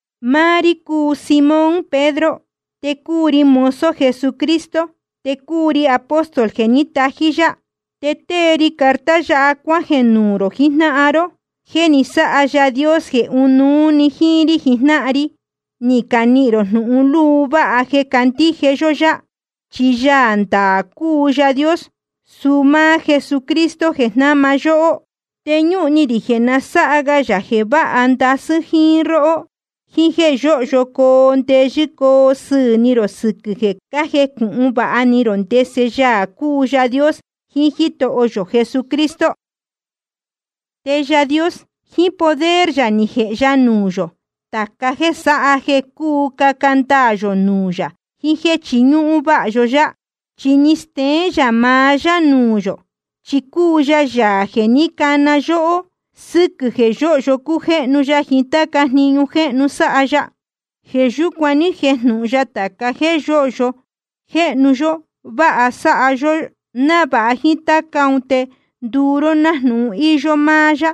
Máá rí cúu Simón Pedro, te cúu ri mozo Jesucristo, te cúu ri apóstol jeē ní tají yá. Te tée ri carta yáha cuájeē nuū rō jijnáhan ró, jeē ni sáha Yaā Dios jeē ɨnuú‑ni jíín rí jijnáhan ri ni canihīn rō jnūhun luu váha jeē cácandíje yó yá. Chi Yaā ndaā cúu Yaā Dios, suu máá Jesucristo jeē jnáma yóhó. Te ñúhun ni rī jeē na sáha ga yā jeē váha ndasɨ́ róhó jíín jéē yóhyo coo ndeyɨ́ coo sɨɨ̄ ni rō sɨquɨ̄ jeē cájecūhun vāha ni rō ndese Yaā cúu Yaā Dios jiín Jítoho yō Jesús. Te Yaā Dios, jíín poder yā ni jēhe ya nuū yō tāca jéē sáha jeē cúu caca ndaā yō nuū yā jiín jéē chiñúhún váha yó yá. Chi ni steén yā maá yá nuū yō, chi cúu ya Yaā jeē ní cana yóhó, sɨquɨ̄ jeē yóhyo cújéhnu ya jiín táca jniñu jéhnu sáha ya. Jeē yúcuan ní jejnūhun ya tāca jéē yóhyo jéhnu yōhyo vāha sáha ya yohó, návāha jíín táca ún te nduu ró nájnūhun íyó máá yá,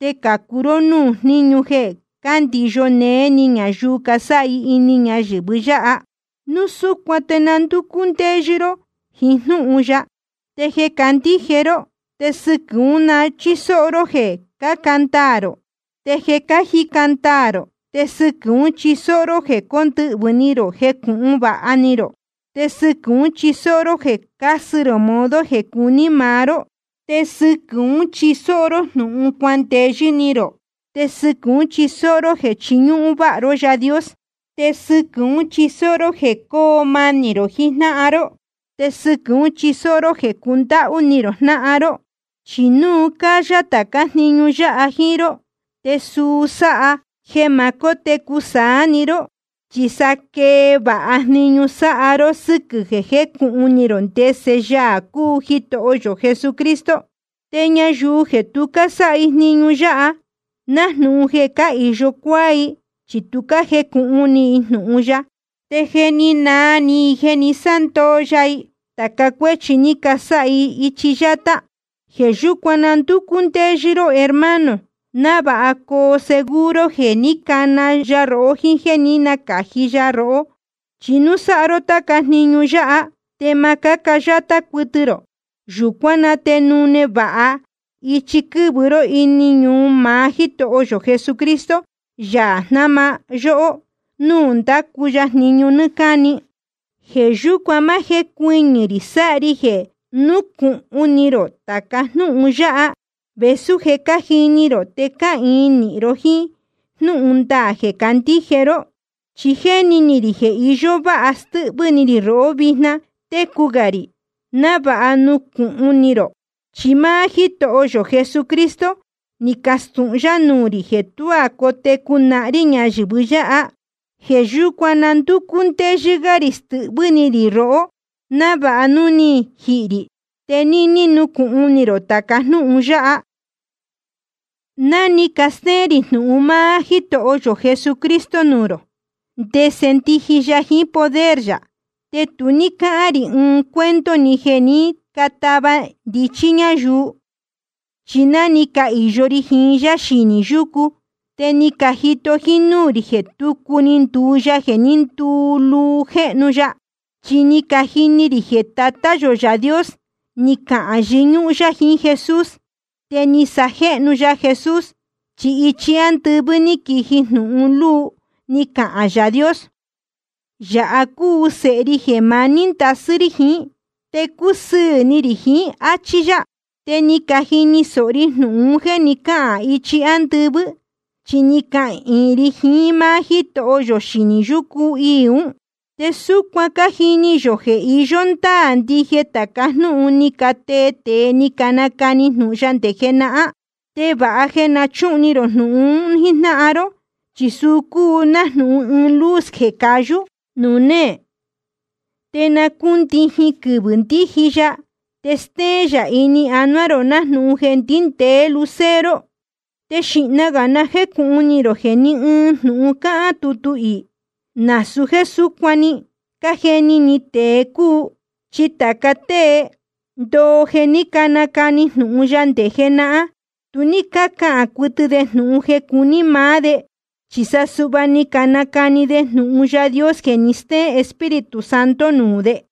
te cācu ró núū jníñu jeē cándiyo néé ni ñayuu casáha i ini ñayɨ̄vɨ yáha. Núu súcuan te na ndúcú ndéyɨ́ ró jiín jnúhun yáha. Te jeē cácandíje ró, te sɨquɨ̄ ún na chísóó ró jeē caca ndaā rō. Te jeē cájica ndaā rō, te sɨquɨ̄ ún chisóó ró jeē cóndɨhvɨ̄ ni rō jecūhun vāha ni rō. Te sɨquɨ̄ ún chisóó ró jeē casɨ rō modo jeē cuní maá ró. Te sɨquɨ̄ ún chisóó ró jnūhun cuandeyɨ́ ni rō, te sɨquɨ̄ ún chisóó ró jeē chiñúhún váha ró Yaā Dios. Te sɨquɨ̄ ún chisóó ró jeē cóo manī rō jiín jnáhan ró, te sɨquɨ̄ ún chisóó ró jeē cundáhú ni rō jnáhan ró. Chi núu cayā tācá jniñu yáha jíín ró, te suu sáha jeē ma cótecu saá‑ni ró, chi sa quee vāha jniñu sáha ró, sɨ́quɨ̄ jeē cájecūhun ni rō ndese Yaā cúu Jitoho yō Jesucristo. Te ñayuu jeē tu cásáha jniñu yáha, nájnūhun jeē cáhīyo cuáá i, chi tu jécūhun ni i jnūhun ya, te je ni naa ni i jeē ni sándoo ya i tāca cuéchi ni casáha i ichi yátá. Jeē yúcuan na ndúcú ndéyɨ́ ró hermano, návāha coo seguro jeē ní cana ya rohó jíín jéē ní nacāji ya rohó. Chi núu sáha ró táca jniñu yáha, te ma cáca yátá cuɨtɨ rō. Yūcuán na te nune vāha ichi quɨ̄vɨ ró ini ñuu maá Jítoho yō Jesucristo, Yaā jnáma yóhó, nuū ndácu ya jniñu nɨ́ɨ́ cáni. Jeē yúcuan ma jécuɨñɨ̄ rī sáha ri jeē núcūhun ni rō tāca jnúhun yáha, vēsú je cájini rō te cáhīin nīhin ró jíín jnúhun ndaā jeē cácandíje ró. Chi jéni ni rī jeē iyó váha stɨ́hvɨ́ ni rī rohó vijna técu gā rī, návāha nucūhun ni rō. Chi máá Jítoho yō Jesucristo ni castūhun yá nuū rī jeē tuá cotecu nahán rí ñayɨ̄vɨ yáha. Jeē yúcuan na ndúcú ndéyɨ́ gá rī stɨhvɨ́ ni rī rohó, návāha núu je ni jihī rī, te níní nucūhun ni rō tāca jnúhun yáha. Ná ni castéén rī jnūhun máá Jítoho yō Jesucristo nuū rō, ndese ndiji ya jiín poder yā, te tu ní cácahān rī ɨɨn cuento‑ni jeē ní catava ndichí ñáyuu. Chi ná ni cahīyo ri jiín yá xinī yúcu, te ni cajito jíín núū rī jeē tucu ni nduu ya jeē ní nduluu jéhnu ya. Chi ni cajini rī jeē Tatá yō Yaā Dios ni cahān yɨñúhún yá jiín Jesús, te ni sajéhnu ya Jesús. Chi ichi ándɨvɨ́ ní quiji jnūhun luu, ni cahān Yaā Dios: Yāha cúu Sēhe ri jeē maní ndasɨ́ rí jiín, te cúsɨɨ̄ ni rī jiín, áchí yá. Te ni cajini sōho ri jnūhun un jéē ni cáhān ichi ándɨvɨ́, chi ni cahīin ri jiín máá Jítoho yō xinī yúcu iī ún. Te súcuan cájini yō jeē iyó ndáā ndije tāca jnúhun ni catee tēe ni canacani jnūhun ya nde jenahán. Te vāha jeē na chúhun ni rō jnūhun un jíjnáhan ró, chi suu cúu nájnūhun ɨɨn luz jeē cayú nuū néē, nde na cúndijin quɨvɨ̄ ndíji ya, te stéén yā ini anuá rō nájnūhun jeē ndíndēé lucero. Te xīhna gā na jécūhun ni rō jeē ni ɨɨn jnūhun cáhán tutu iī, nasūu jéē súcuan‑ni ni cajeni ni tēe cúu. Chi tāca tée ndoo jeē ní canacani jnūhun ya nde jenahán, tu ní cácahān cuɨtɨ de jnūhun jeē cúu ni maá de. Chi sa suhva ni canacani de jnūhun Yaā Dios jeē ni stéén Espíritu Santo nuū de.